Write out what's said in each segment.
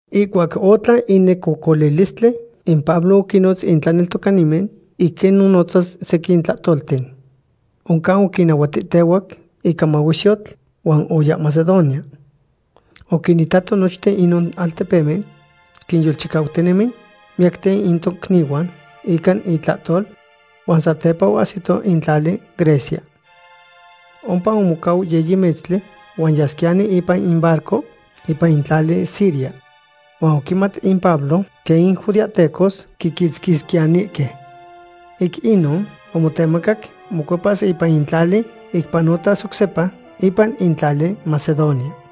Ihcuac otlan in necocolilistli, in Pablo oquinnotz in tlaneltocanimen ic quinnonotzas sequin tlahtolten. Oncan oquinnahuatihtehuac ica mahuesyotl huan oya Macedonia. Oquinitato nochin inon altepemen, quinyolchicautinemi miyacten in tocnihuan ica itlahtol, huan satepa oahsito in tlali Grecia. Ompa omocau yiyi metztli, huan yasquiyani ipan in barco ipan in tlali Siria. Huan oquimat in Pablo quen in judeahtecos quiquitzquisquiyanihque. Ic inon omotemacac mocuepas ipan in tlali, ic panotas oc sepa ipan in tlali Macedonia.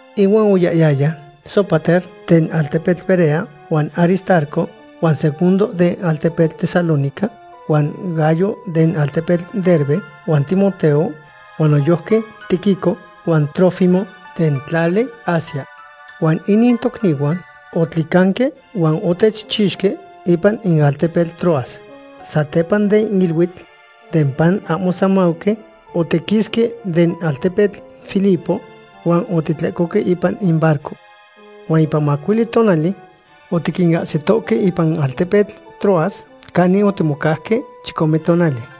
Ihuan oyahyaya Sópater den altepetl Berea, huan Aristarco huan Segundo den altepetl Tesalónica, huan Gayo den altepetl Derbe, huan Timoteo, huan noyojqui Tíquico huan Trófimo den tlali Asia. Huan inin tocnihuan otlicanque huan otechchixque ipan in altepetl Troas. Satepa den iluitl den pan ahmo semauqui, otiquisque den altepetl Filipo huan otitlecohque ipan in barco. Huan ipan macuili tonali otiquinahsitohque ipan in altepetl Troas canin otimocauque chicome tonali.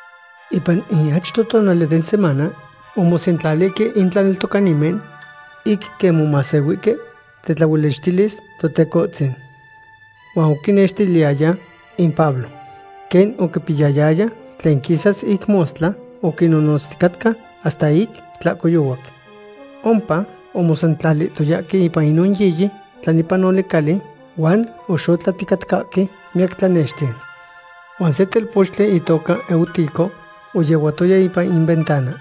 Ipan in achto tonali den semana omosentlalihque in tlaneltocanimen ic quimomahsehuihque tetlaolichtilis Totecohtzin. Huan oquinnextiliyaya in Pablo. Quen oquipiyayaya tlen quisas ic mostla, oquinonotzticatca hasta ic tlahcoyohuac. Ompa omosentlalihtoyahque ipan inon yiyi tlanepanoli cali, huan oxotlahticatcahque miyac tlanexten. Huan se telpochtli itoca Eutico oyehuatoya ipan in ventana.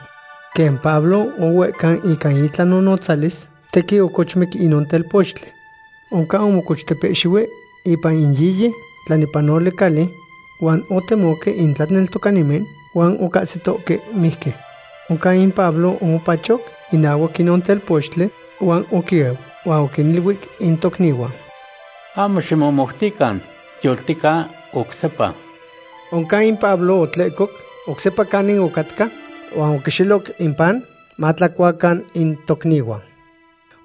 Quen Pablo ohuehcau ica itlanonotzalis, tequin ocochmic inon telpochtli. Oncan omocochtepehxihui ipan in yiyi tlanepanoli cali, huan otemoque in tlaneltocanimen huan ocahsitohque mijqui. Oncan in Pablo omopachoc inahuac inon telpochtli huan oquieu. Huan oquiniluic in tocnihuan: ―Ahmo ximomoutican, yoltica oc sepa. Oncan in Pablo otlehcoc oc sepa canin ocatca, huan oquixeloc in pan matlacuacan in tocnihuan.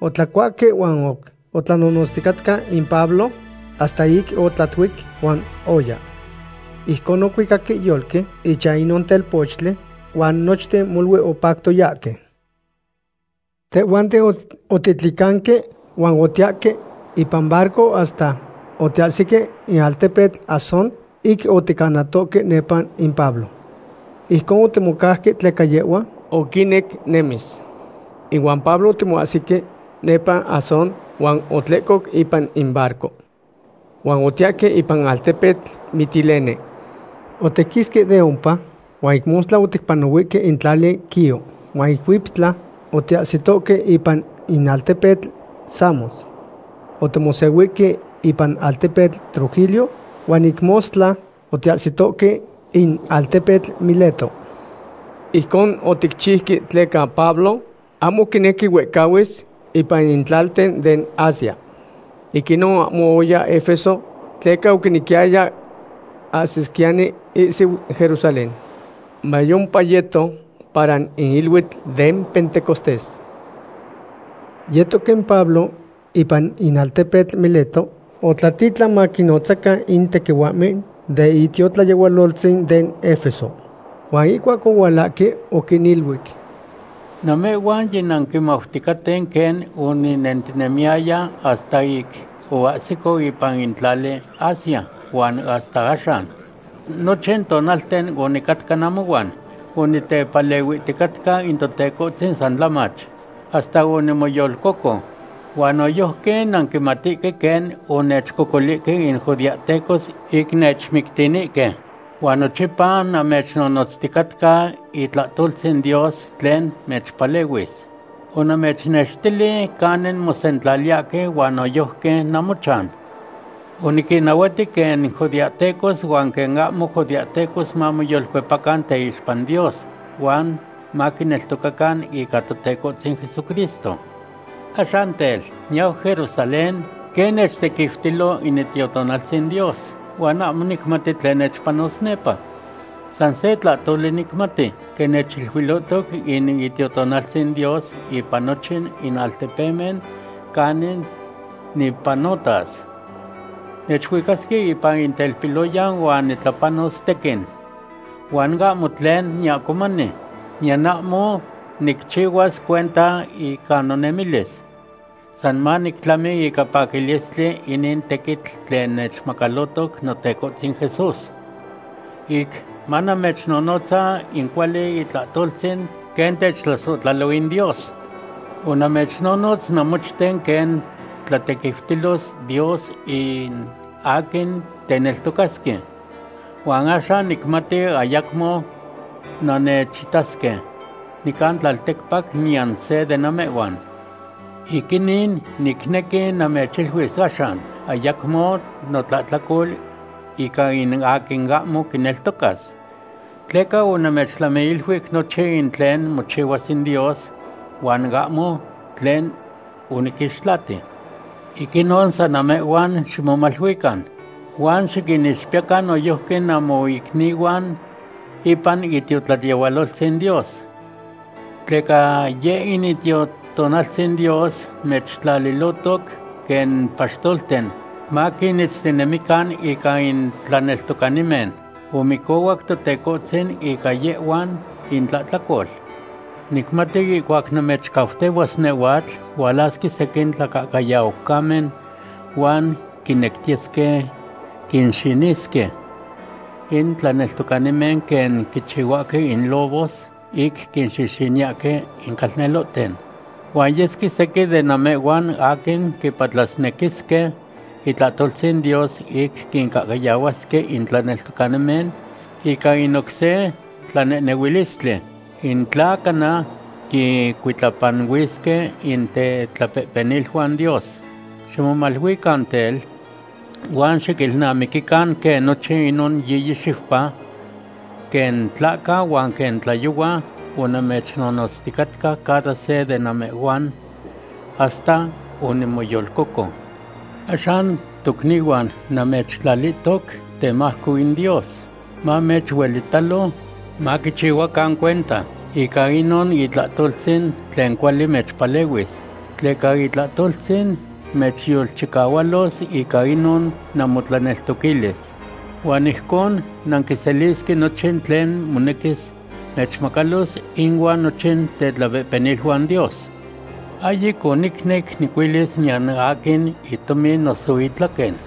Otlacuahque huan oc otlanonotzticatca in Pablo hasta ic otlatuic, huan oya. Ijcon ocuicaque yolqui ichan inon telpochtli huan nochten molui opactoyahque. Tehhuanten otitlicanque huan otiyahque ipan barco hasta otiyahsihque in altepetl Asón ic oticanatohque nepa in Pablo. Ijcon otimocauque tleca yehhua oquinec nehnemis. Ihuan Pablo otimoahsihque nepa Asón huan otlehcoc ipan in barco. Huan otiyahque ipan in altepetl Mitilene. Otiquisque de ompa huan ic mostla oticpanahuihque in tlali Quío, huan ic huiptla otiyahsitohque ipan in altepetl Samos. Otimosehuihtohque ipan altepetl Trogilio, huan ic mostla otiyahsitohque in altepetl Mileto. Ijcon oticchiuque tleca Pablo ahmo quinequi huehcahuis ipan in tlalten den Asia. Ic inon ahmo oya Efeso tleca oquinequiyaya ahsisquiyani ihsiu Jerusalén, mayompa yeto para in iluitl den Pentecostés. Yetoc in Pablo ipan in altepetl Mileto, otlatitlan maquinnotzacan in tequihuahmen den itiotlayehualoltzin den Efeso. Huan ihcuac ohualahque, oquiniluic: ―Namehhuan yinanquimauticaten quen oninentinemiyaya hasta ic oniahsico ipan in tlali Asia huan hasta axan. Nochin tonalten onicatca namohuan onitepalehuihticatca in Totecohtzin san tlamach, hasta onimoyolcoco. Huan noyojqui nanquimatihque quen onechcocolihque in judeahtecos ic nechmictinihque. Huan nochipa namechnonotzticatca itlahtoltzin Dios tlen mechpalehuis. Onamechnextili canin mosentlaliyahque huan noyojqui namochan. Oniquinnahuati quen judeahtecos huan quen ahmo judeahtecos mamoyolcuepacan teixpa in Dios huan maquineltocacan ica Totecohtzin Jesucristo. Axan tel, niyau Jerusalén, quen nechtequiutilo in Itiotonaltzin Dios, huan ahmo nicmati tlen nechpanos nepa. San se tlahtoli nicmati, quen nechiluilohtoc in Itiotonaltzin Dios ipan nochin in altepemen canin nipanotas. Nechuicasque ipan in telpiloyan huan nitlapanos tequin. Huan ahmo tlen niahcomani, niyan ahmo nicchihuas cuenta ica nomemilis. San manictlami ica paquilistli inin tequitl tlen nechmacalohtoc Notecohtzin Jesús, ic manamechnonotza in cuali itlahtoltzin quen techtlasohtlalo in Dios. ’Onamechnonotz namochten quen tlatequiutilos Dios in aquin teneltocasque. Huan axan nicmati ayacmo nannechitasque nican tlalticpac niyan se de namehhuan. Ic inin, nicnequi namechiluis axan ayacmo notlahtlacol ica in aquin ahmo quineltocas. Tleca onamechtlamiiluic nochin in tlen mochihuas in Dios, huan ahmo tlen oniquixtlati. Ic inon san namehhuan ximomaluican huan xiquinixpiyacan noyojqui namoicnihuan ipan itiotlayehualoltzin Dios. Tleca yeh in Itiotonaltzin Dios mechtlalihtoc quen paxtolten maquinitztinemican ica in tlaneltocanimen. Omicohuac Totecohtzin ica yehhuan intlahtlacol. Nicmati ihcuac namechcautehuas nehhuatl, hualasque sequin tlacahcayaucamen huan quinectiyesque quinxinisque in tlaneltocanimen quen quichihuahque in lobos ic quinxixiniyahque in calnelohten. Huan yesque sequin de namehhuan aquin quipatlasnequisque itlahtoltzin Dios ic quincahcayahuasque in tlaneltocanimen ica in oc se tlanehnehuilistli, in tla cana quincuitlapanuisque in tetlapehpeniluan Dios. Ximomaluican tel, huan xiquilnamiquican quen nochin inon yiyi xiupa, quen tlahca huan quen tlayohua onamechnonotzticatca cada se de namehhuan hasta onimoyolcoco. ’Axan tocnihuan, namechtlalihtoc temajco in Dios, mamechuelitalo. Maquichihuacan cuenta ica inon itlahtoltzin tlen cuali mechpalehuis. Tleca itlahtoltzin mechyolchicahualos ica inon namotlaneltoquilis. Huan ijcon nanquiselisque nochin tlen monequis mechmacalos inuan nochin tetlapehpeniluan Dios. Ahyic onicnec nicuilis niyan aquin itomin noso itlaquen.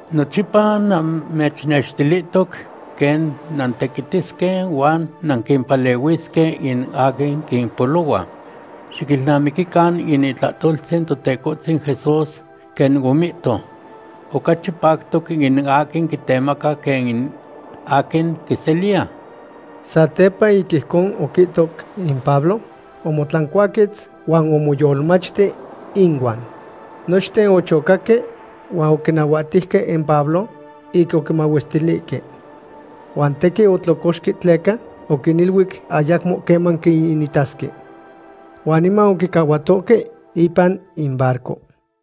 Nochipa namechnextilihtoc quen nantequitisque huan nanquimpalehuisque in aquin quimpolohua. Xiquilnamiquican in itlahtoltzin Totecohtzin Jesús, quen omihto: “Ocachi pactoc in aquin quitemaca quen in aquin quiseliya.” Satepa ic ijcon oquihtoc in Pablo, omotlancuaquetz huan omoyolmachti inuan. Nochten ochocaque huan oquinahuahtejque in Pablo ic oquimahuestilihque. Huan tequin otlocoxque tleca oquiniluic ayacmo queman quiitasque. Huan niman oquicahuatohque ipan in barco.